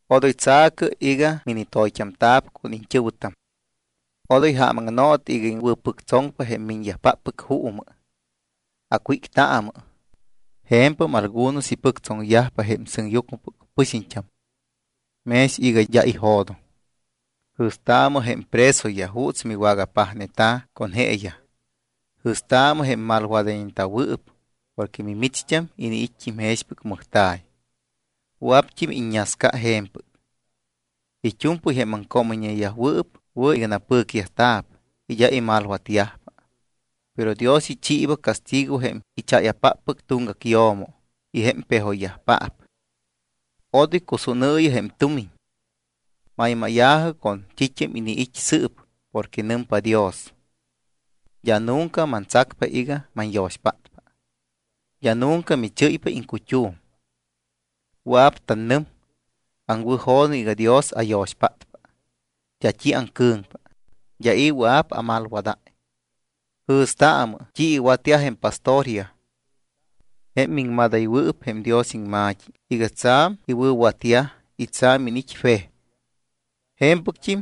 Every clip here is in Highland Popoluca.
Odoy tsa̱cɨ iga minitoyt́amta̱p con iñt́ɨ̱wɨtam. Odoy ja̱mnootɨ iga iŋwɨ̱pɨctsoŋpa jém miñyajpáppɨc juumɨ. Acwíctaamɨ. Je̱mpɨgam algunos ipɨctsoŋyaj jém sɨŋyucmɨpɨc pɨxiñt́am mex iga d́a ijo̱doŋ. Jɨ̱staamɨ jém presoyaj juuts miwagapajneta̱ con jeeyaj. Jɨ̱staamɨ jém malwadayñeta̱wɨɨp porque mimicht́am iniit́t́im jexpɨc mɨjta̱y. Wɨa̱pt́im iññasca je̱mpɨc. It́u̱mpɨy jém aŋcoomɨyñeyajwɨɨp wɨ̱ iga napɨcyajta̱p y d́a imalwatyajpa. Pero Dios ichiiba castigo jém ichaya̱páppɨc tuŋgac yo̱mo y jém pejoypaap. Odoy cusúnɨɨyɨ jém tumiñ. Maymáya̱jɨ con t́it́am iniit́ sɨɨp porque nɨmpa Dios: “D́a nunca mantsacpa iga manyo̱xpátpa. D́a nunca michɨ́ypa iŋcut́um.” Wɨa̱p tanɨm: Aŋwɨ̱jo̱doŋ iga Dios ayo̱xpátpa. D́a t́i aŋcɨ̱ŋpa. D́a i̱ wɨa̱p amalwadáy. Jɨ̱staamɨ t́i iwatyaj jém pastoryaj, jém miŋmadayñewɨɨp jém Dios iŋma̱t́i iga tsa̱m iwɨ̱watyaj y tsa̱m iniit́yaj fe. Je̱mpɨct́im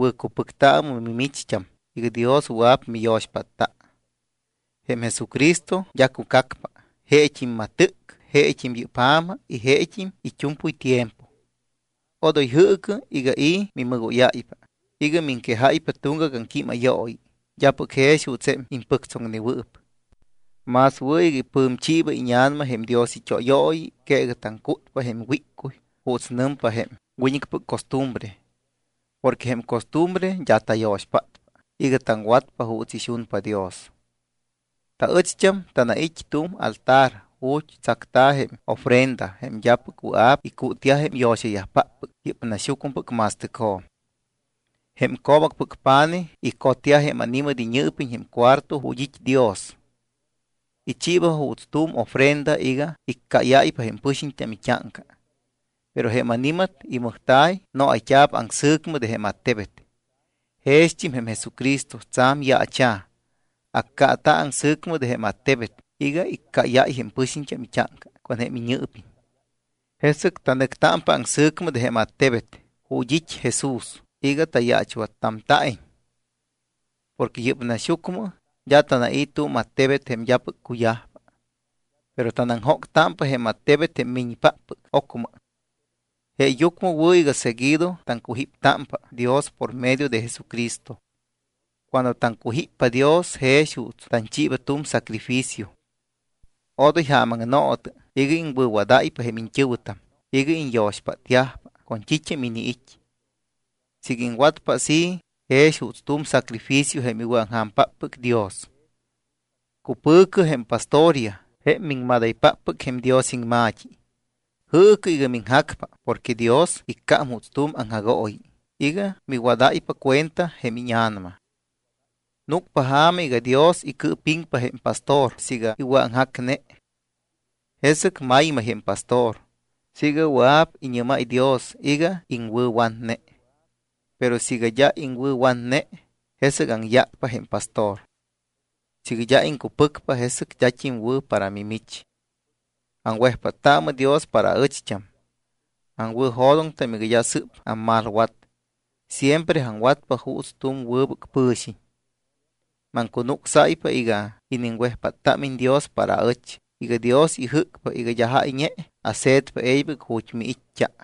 wɨ̱cupɨctaamɨ mimicht́am iga Dios wɨa̱p miyo̱xpátta. Jém Jesucristo d́a cucacpa. Jeet́im matɨc, jeet́im yɨ́p ja̱ma y jeet́im it́u̱mpɨy tiempo. Odoy jɨɨcɨ iga i̱ mimɨgóyáypa iga miŋquejáypa tuŋgac aŋquímayooyi d́apɨc jex juuts jém impɨctsoŋnewɨɨp. Más wɨ̱ iga ipɨ̱mchiiba íña̱nama jém Dios it́óyooyi que iga taŋcútpa jém wíccuy juuts nɨmpa jém wiñɨcpɨc costumbre. Porque jém costumbre d́a tayo̱xpátpa iga taŋwatpa juuts ixunpa Dios. Taɨcht́am tanait́ tu̱m altar ju̱t́ tsacta̱ jém ofrenda, jém d́apɨc wɨa̱p icútyaj jém yo̱xapáppɨc yɨ́p naxyucmɨpɨc ma̱stɨcjo̱m. Jém co̱bacpɨc pa̱nijyaj icotyaj jém ani̱mat iñɨɨpiñ jém cuarto ju̱t́ it́ Dios. Ichiiba juuts tu̱m ofrenda iga iccáyáypa jém pɨxiñt́am it́áŋca. Pero jém ani̱mat imɨjta̱y noayt́a̱p aŋsɨ̱cmɨ de jém attebet. Jext́im jém Jesucristo tsa̱m yaacha̱, accaata̱ aŋsɨ̱cmɨ de jém attebet iga iccáyáy jém pɨxiñt́am it́áŋca con jém iñɨɨpiñ. Jesɨc tanɨctámpa aŋsɨ̱cmɨ de jém attebet ju̱t́ it́ Jesús iga tayaachwattamta̱iñ. Porque yɨ́p naxyucmɨ d́a tanai̱ tu̱m attebet jém d́apɨc cuyajpa. Pero tanaŋjóctámpa jém attebet jém miñpáppɨc ocmɨ. Jeeyucmɨ wɨ̱ iga seguido taŋcujíptámpa Dios por medio de Jesucristo. Cuando taŋcujíppa Dios jex juuts tanchiiba tu̱m sacrificio. Odoy ja̱mnootɨ iga iŋwɨ̱wadáypa jém iñt́ɨ̱wɨtam iga iñyo̱xpátyajpa con t́it́am iniit́. Siiga iŋwatpa así jex juuts tu̱m sacrificio jém iwɨ̱aŋja̱mpáppɨc Dios. Cupɨ̱cɨ jém pastoryaj jém miŋmadaypáppɨc jém Dios iŋma̱t́i. Jɨɨcɨ iga miŋjacpa porque Dios iccám juuts tu̱m aŋjagooyi iga miwadáypa cuenta jém íña̱nama. Núcpa ja̱ma iga Dios icɨɨpiŋpa jém pastor siiga iwɨ̱aŋjacne. Jesɨc maymay jém pastor siiga wɨa̱p iñɨ́máy Dios iga iŋwɨ̱watne. Pero siiga d́a iŋwɨ̱watne, jesɨc aŋyácpa jém pastor. Siiga d́a iŋcupɨcpa, jesɨc d́at́im wɨ̱ para mimich. Aŋwejpáttaamɨ Dios para aɨcht́am. Aŋwɨ̱jo̱doŋtam iga d́a sɨ́p ammalwat. Siempre aŋwatpa juuts tu̱m wɨbɨc pɨ̱xiñ. Maŋcunucsáypa iga iniŋwejpáttámiñ Dios para aɨch iga Dios ijɨ́cpa iga d́a jáyñe ase̱tpa e̱ybɨc ju̱t́ miit́t́a.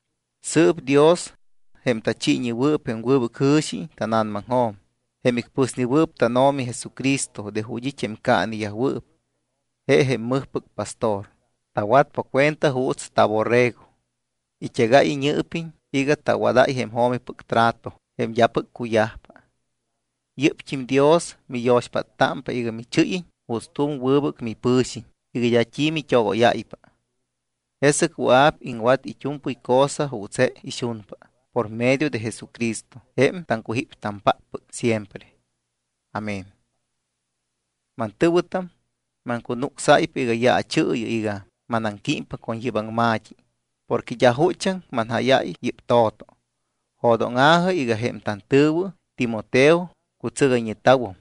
Sɨɨp Dios jém tachiiñewɨɨp jém wɨbɨc jɨ̱xi tána̱namaŋjo̱m, jém icpɨsnewɨɨp tánO̱mi Jesucristo de ju̱t́ it́ jém caaneyajwɨɨp, je jém mɨjpɨc pastor, tawatpa cuenta juuts taborrego, it́egáy iñɨɨpiñ iga tawadáy jém jo̱mipɨc trato jém d́apɨc cuyajpa, yɨ́pt́im Dios miyo̱xpáttámpa iga michɨ́yiñ juuts tu̱m wɨbɨc mipɨ̱xiñ iga d́a t́i mit́ogóyáypa. Jesɨc wɨa̱p iŋwat it́u̱mpɨy cosa juuts je ixunpa por medio de Jesucristo jém taŋcujíptampáppɨc siempre. Amén. Mantɨ̱wɨtam, maŋcunucsáypa iga yaachɨɨyɨ iga manaŋquímpa con yɨ́p aŋma̱t́i, porque d́a juchaŋ manjáyáy yɨ́p to̱to. Jo̱dóŋa̱jɨ iga jém tantɨ̱wɨ Timoteo cutsɨgayñeta̱wum.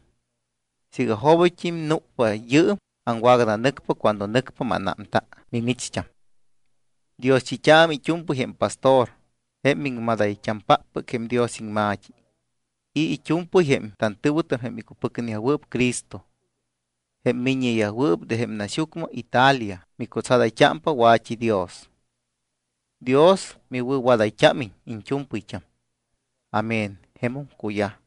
Siiga jobit́t́im núcpa yɨɨm aŋwagananɨcpa cuando nɨcpa mánámta mimicht́am. Dioschit́aamɨ it́u̱mpɨy jém pastor jém miŋmadayt́ampáppɨc jém Dios iŋma̱t́i y it́u̱mpɨy jém tantɨ̱wɨtam jém icupɨcneyajwɨɨp Cristo. Jém miññeyajwɨɨp de jém naxyucmɨ Italia micutsadayt́ámpa wa̱t́i Dios. Dios miwɨ̱wadayt́ámiñ iñt́u̱mpɨyt́am. Amén. Jemum cuyaj.